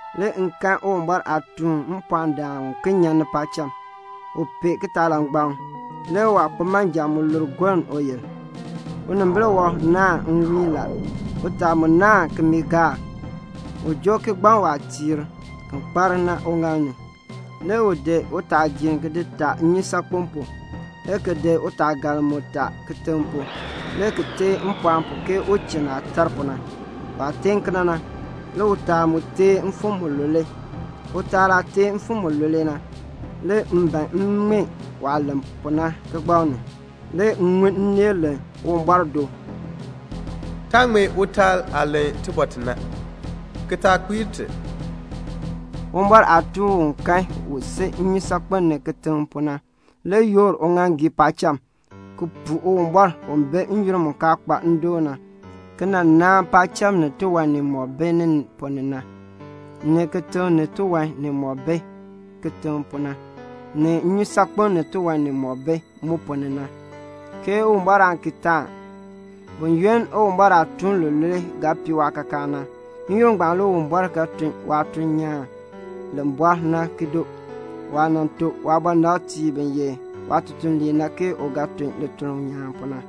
Le m kan Uwumbɔr aatuun mpɔɔndaan uken nyan paacham. U pee kitaalangbaŋ. Le waakpimanja mu lur goln uyil. Unimbil wɔb naahn nwiin la. Utaa mu naahn kimiigaak. U joo kigbaŋ waatiir ki kpar na uŋaal ni. Le u di utaagiir ki di taa nnyusaakpem pu, le ki di utaagaln mu taa kitiŋ pu, le ki teen mpɔɔn pu ke uchinn aah tar pu na. Waah teen kena na, le utaal mu teen mfim mulule. Utaal aah teen mfim mulule na, le m ban m ŋmee waah len pu na kigbaŋ ni. Le m ŋun nneel len Uwumbɔr do, "Taa ŋmee utaal aah len tibɔr ti na, ki taa kpiir ti." Uwumbɔr aatuun u m kan u si nnyusaakpem ni kitiŋ pu na le yoor uŋaaŋgii paacham ki puu Uwumbɔr u bi n-yoonn mu kaa kpa ndoon na ki nan naan paacham ni tiwan nimɔk bi ni ponn ni na, ni kitiŋ ni tiwan nimɔk bi kitiŋ na, ni nnyusaakpem ni tiwan nimɔk bi mu ponn ni na, ke Uwumbɔr aan ki taan. Buyoonn Uwumbɔr aatuun lulule ga pii waakaakaan na, n-yoonn ngbaan le Uwumbɔr ga tun waatuln nyaan li bɔr na ki doo, waah nan tuk waabɔnabtiib bi ye waatutuliib na ke u ga tun lituln nyaan pu na.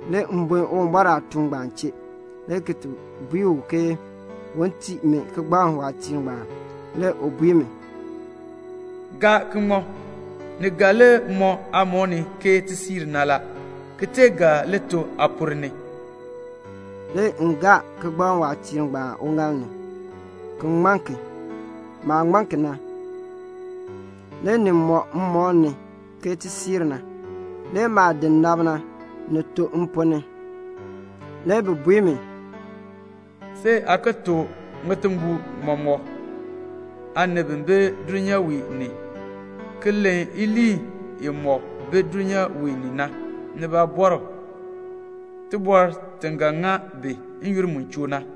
Le m buen Uwumbɔr aatuun ngbaan chee, le ki bui u ke un tii mi kigbaŋ waatiir ngbaan. Le u bui mi, "Gaa ki ŋma. Ni ga li mɔ aamɔb ni ke tisiir na la, ki ga li to aaponn ni." Le m gaa kigbaŋ waatiir ngbaan uŋaal ni, ki ŋman ki. Maah ŋman ki na, le ni mɔ mmɔb ni ke tisiir na. Le maah nab na, ni to mponn ni. Le bi bui mi, "See aa ki tuk ŋitimbol mɔmɔk aanib bi bi dulnyaa wee ni ki len iliin imɔk bi dulnyaa wee ni na, ni baabɔrb, tibɔr ti ga ŋa bi n-yoonn mu choo na."